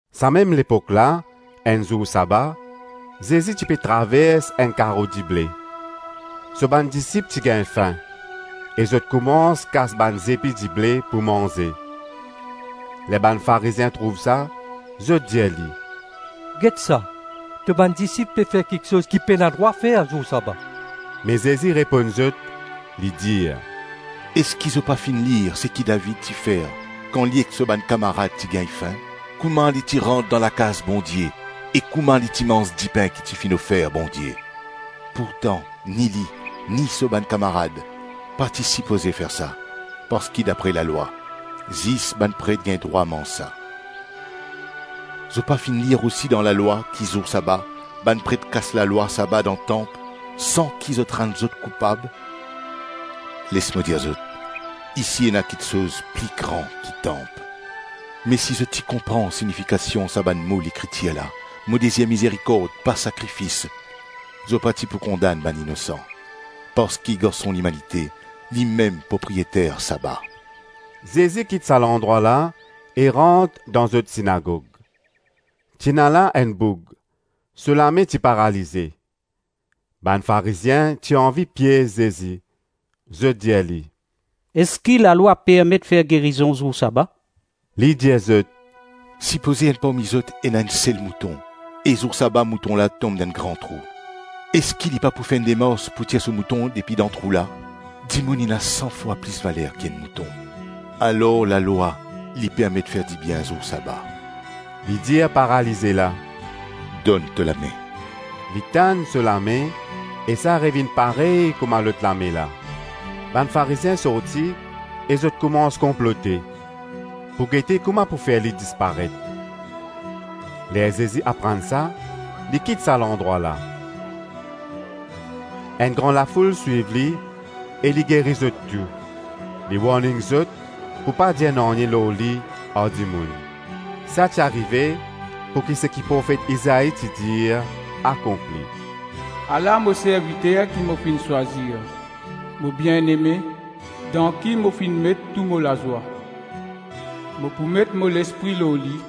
Sa mem lepok la, enn zour saba, Zezi ti pe travers enn karo dible; so bann disip ti gagn fin, e zot koumans kas bann zepi dible pou manze. Ler bann Farizien trouv sa, zot dir li, “Get sa, to bann disip pe fer kiksoz ki pena drwa fer zour saba.” Me Zezi reponn zot, li dir, “Eski zot pa finn lir seki David ti fer kan li ek so bann kamarad ti gagn fin? Koman li ti rant dan lakaz Bondie e kouma li ti manz dipin ki ti finn ofer Bondie? Pourtan ni li, ni so bann kamarad pa ti sipoze fer sa, parski dapre lalwa, zis bann pret gagn drwa manz sa. Zot pa finn lir osi dan lalwa, ki zour saba, bann pret kas lalwa saba dan tanp san ki zot rann zot koupab? Les mo dir zot, isi ena kiksoz pli gran ki tanp. Me si zot ti konpran sinifikasion sa bann mo Lekritir la, ‘mo dezir mizerikord, pa sakrifis,’ zot pa ti pou kondann bann inosan. Parski Garson Limanite, limem propriyeter saba.” Zezi kit sa landrwa la e rant dan zot sinagog; ti ena la enn boug; so lame ti paralize. Bann Farizien ti anvi piez Zezi; zot dir li, “Eski lalwa permet fer gerizon zour saba?” Li dir zot, “Sipoze enn parmi zot ena enn sel mouton e zour saba mouton la tom dan enn gran trou; eski li pa pou fer enn demars pou tir so mouton depi dan trou la? Dimoun ena san fwa plis valer ki enn mouton. Alor lalwa li permet fer dibien zour saba.” Li dir paralize la; “Donn to lame.” Li tann so lame, e sa revinn parey kouma lot lame la. Bann Farizien sorti e zot koumans konplote, pou gete kouma pou fer li disparet. Ler Zezi aprann sa, li kit sa landrwa la. Enn gran lafoul swiv li e li geri zot tou, li warning zot pou pa dir nanye lor li ar dimoun. Sa ti arive pouki seki profet Izai ti dir akonpli: “Ala mo serviter, ki mo finn swazir, mo bieneme, dan ki mo finn met tou mo lazwa. Mo pou met mo Lespri lor li,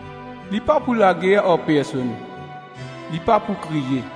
Li pa pou lager ar personn, li pa pou kriye,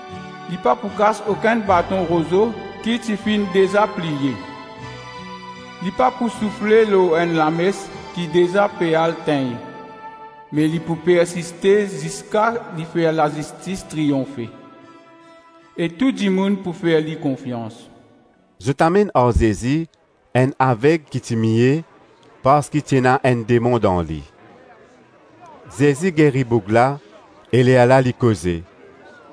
li pa pou kas okenn baton rozo ki ti finn deza pliye, li pa pou soufle lor enn lames ki deza pe al tegn. Me li pou persiste ziska li fer lazistis triyonfe, e tou dimoun pou fer li konfians.” Zot amenn ar Zezi enn aveg ki ti mie parski ti ena enn demon dan li. Zezi geri boug la e lerla li koze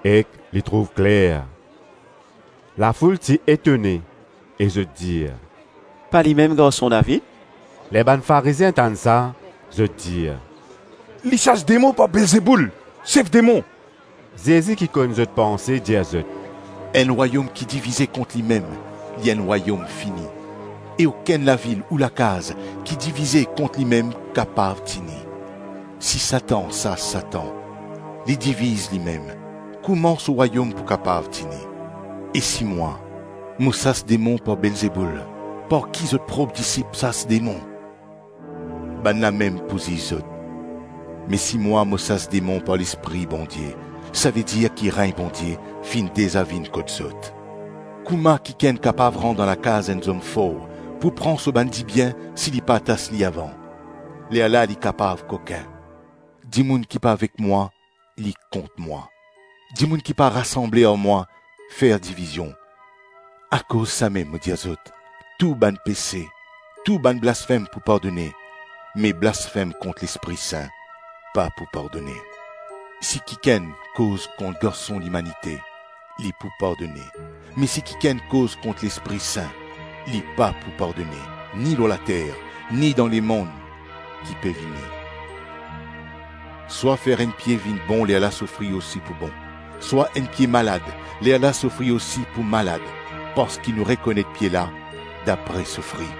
ek li trouv kler. Lafoul ti etone e zot dir, “Pa limem Garson David?” Ler bann Farizien tann sa, zot dir, “Li sas demon par Belzeboul, sef demon.” Zezi ki konn zot panse dir zot, “Enn rwayom ki divize kont limem, li enn rwayom fini, e okenn lavil ou lakaz ki divize kont limem kapav tini. Si Satan sas Satan, li diviz limem; kouma so rwayom pou kapav tini? E si mwa, mo sas demon par Belzeboul, par ki zot prop disip sas demon? Bann la mem pou ziz zot. Me si mwa, mo sas demon par Lespri Bondie, savedir ki regn Bondie finn deza vinn kot zot. Kouma kikenn kapav rant dan lakaz enn zom for pou pran so bann dibien si li pa atas li avan? Lerla li kapav kokin. Dimoun ki pa avek mwa, li kont mwa, dimoun ki pa rasanble ar mwa, fer divizion. Akoz samem mo dir zot, tou bann pese, tou bann blasfem pou pardone, me blasfem kont Lespri Sin pa pou pardone. Si kikenn koz kont Garson Limanite, li pou pardone, me si kikenn koz kont Lespri Sin, li pa pou pardone, ni lor later ni dan lemonn ki pe vini. Swa fer enn pie vinn bon lerla so fri osi pou bon, swa enn pie malad lerla so fri osi pou malad, parski nou rekonet pie la dapre so fri.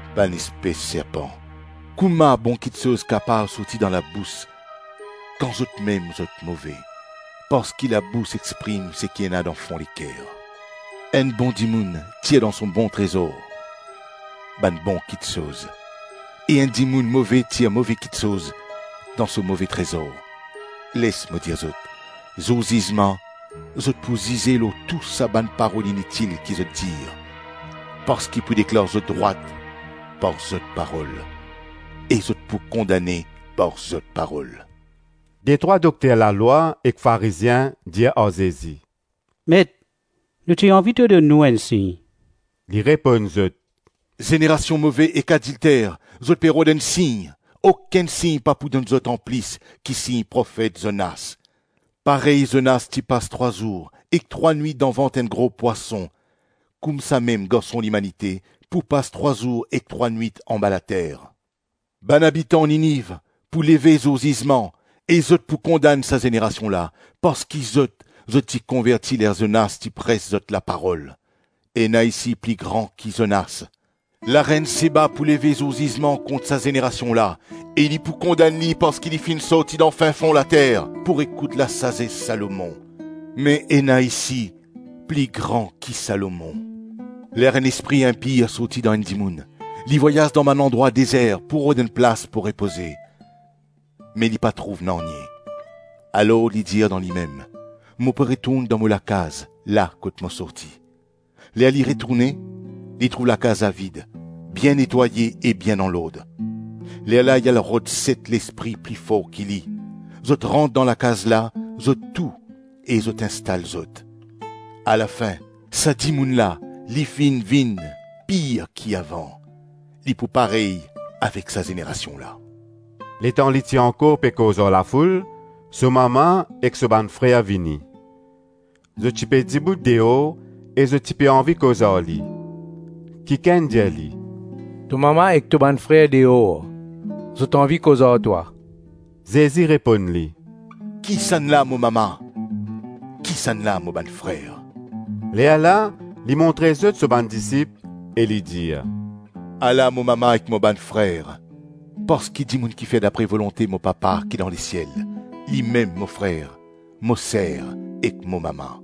Bann espes serpan! Kouma bon kiksoz kapav sorti dan zot labous, kan zotmem zot move? Parski labous exprim seki ena dan fon leker. Enn bon dimoun tir dan so bon trezor bann bon kiksoz, e enn dimoun move tir move kiksoz dan so move trezor. Les mo dir zot, zour zizman zot pou zize lor tou sa bann parol initil ki zot dir; parski pou deklar zot drwat par zot parol, e zot pou kondane par zot parol.” Detrwa dokter lalwa ek Farizien dir ar Zezi, “Met, nou ti anvi to donn nou enn sign.” Li reponn zot, “Zenerasion move ek adilter, zot pe rod enn sign, okenn sign pa pou donn zot anplis ki sign profet Zonas. Parey Zonas ti pas trwa zour ek trwa nwit dan vant enn gro pwason, koumsamem Garson Limanite pou pas trwa zour ek trwa nwit anba later. Bann abitan Niniv pou leve zour zizman e zot pou kondann sa zenerasion la, parski zot, zot ti konverti ler Zonas ti pres zot la parol. Ena isi pli gran ki Zonas! Larenn Seba pou leve zour zizman kont sa zenerasion la e li pou kondann li parski li finn sorti dan fin-fon later pou ekout lasazes Salomon. Me ena isi pli gran ki Salomon!” “Ler enn lespri inpir sorti dan enn dimoun, li vwayaz dan bann landrwa dezer pou rod enn plas pou repoze, me li pa trouv nanye. Alor li dir dan limem, ‘Mo pou retourn dan mo lakaz, la kot mo sorti.’ Ler li retourne, li trouv lakaz la vid, bien netwaye e bien dan lord. Lerla li al rod set lespri pli for ki li, zot rant dan lakaz la zot tou e zot instal zot; alafin, sa dimoun la li finn vinn pir ki avan. Li pou parey avek sa zenerasion la.” Letan li ti ankor pe koz ar lafoul, so mama ek so bann frer vini. Zot ti pe dibout deor e zot ti pe anvi koz ar li. Kikenn dir li, “To mama ek to bann frer deor, zot anvi koz ar twa.” Zezi reponn li, “Kisannla mo mama? Kisannla mo bann frer?” Lerla li montre zot so bann disip e li dir, “Ala mo mama ek mo bann frer! Parski dimoun kifer dapre volonte mo Papa ki dan lesiel, limem mo frer, mo ser ek mo mama.”